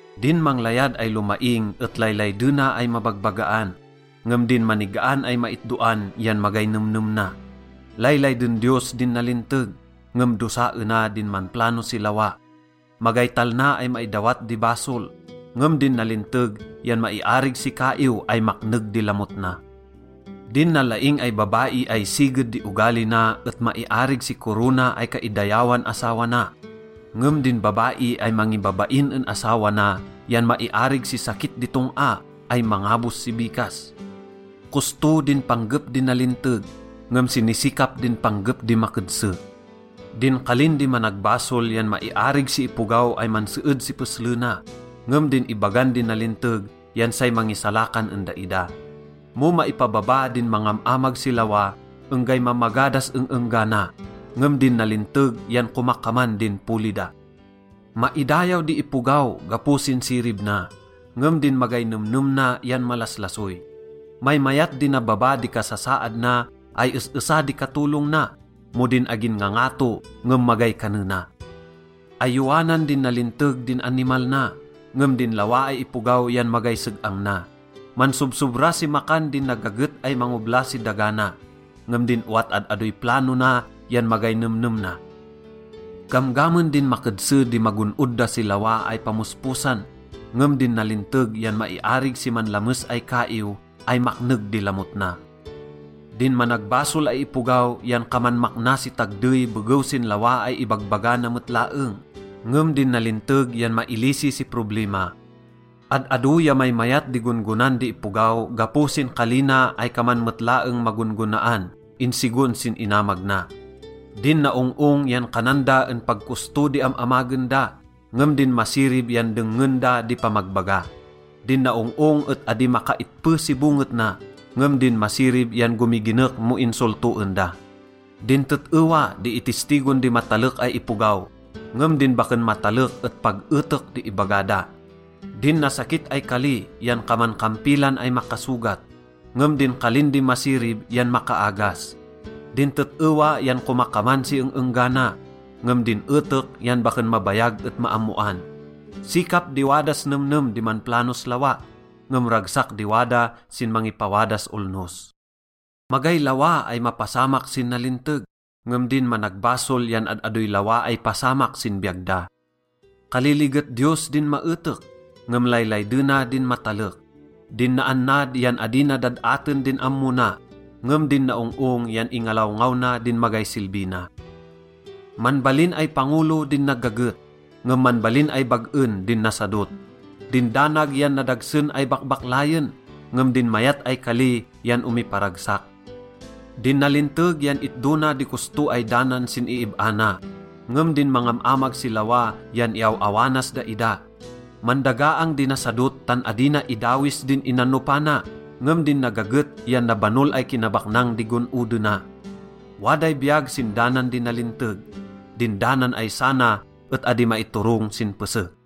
Din manglayad ay lomaing et laylaydena ay mabagbagaan, ngem din manigaan ay maitdoan yan magay nemnem na. Laylayden Diyos din nalinteg, ngem dosaena din manplano si lawa. Magay talna ay maidawat di basol, ngem din nalinteg yan maiarig si kaiw ay makneg di lamot na. Din nalaing ay babai ay siged di ogali na et maiarig si korona ay kaidayawan asawa na, ngem din babai ay mangibabain en asawa na yan maiarig si sakit di tong-a ay mangabos si bikas. Kosto din panggep di nalinteg, ngem sinisikap din panggep di makedse. Din kalin di managbasol yan maiarig si ipogaw ay manseed si peslena, ngem din ibagan di nalinteg yan say mangisalakan en daida. Mo maipababa din mangam-amag si lawa, enggay mamaga das eng-enggana, ngem din nalinteg yan komakaman din poli da. Maidayaw di ipogaw gapo sin sirib na, ngem din magay nemnem na yan malaslasoy. Maymayat di nababa di kasasaad na ay es-esa di katolong na mo din agin ngangato ngem magay kanena. Ayowanan din nalinteg din animal na, ngem din lawa ay ipogaw yan magay seg-ang na. Mansobsobra si makan din nagaget ay mangobla si daga na, ngem din owat ad-adoy plano na yan magay nemnem na. Gamgamen din makedse di magon-od da si lawa ay pamosposan, ngem din nalinteg yan maiarig si manlames ay kaiw ay makneg di lamot na. Din managbasol ay ipogaw yan kaman makna si tagdey begew sin lawa ay ibagbaga na met laeng, ngem din nalinteg yan mailisi si problima. Ad-ado ya maymayat di gon-gonan di ipogaw gapo sin kali na ay kaman met laeng magon-gonaan insigon sin inamag na. Din naong-ong yan kanan da en pag kosto di am-amagen da, ngem din masirib yan dengngen da di pamagbaga. Din naong-ong et adi makaitpe si bonget na, ngem din masirib yan gomiginek mo insoltoen da. Din tet-ewa di itistigon di matalek ay ipogaw, ngem din baken matalek et pag etek di ibaga da. Din nasakit ay kali yan kaman kampilan ay makasogat, ngem din kalin di masirib yan makaagas. Din tet-ewa yan komakaman si eng-enggana, ngem din etek yan baken mabayag et maammoan. Sikap di wadas nemnem di manplanos lawa, ngem ragsak di wada sin mangipawadas olnos. Magay lawa ay mapasamak sin nalinteg, ngem din managbasol yan ad-adoy lawa ay pasamak sin biyag da. Kaliliget Diyos din maetek, ngem laylaydena din matalek. Din naannad yan adi na dad-aten din ammo na, ngem din naong-ong yan ingalawngaw na din magay silbi na. Manbalin ay pangolo din nagaget, ngem manbalin ay bag-en din nasadot. Din danag yan nadagsen ay bakbaklayen, ngem din mayat ay kali yan omiparagsak. Din nalinteg yan itdo na di kosto ay danan sin iib-a na, ngem din mangam-amag si lawa yan iaw-awanas daida. Mandagaang di nasadot tan adi na idawis din inanopana, ngem din nagaget yan nabanol ay kinabaknang di gon-odena. Waday biyag sin danan di nalinteg. Din danan ay sana et adi maiturong sin pese.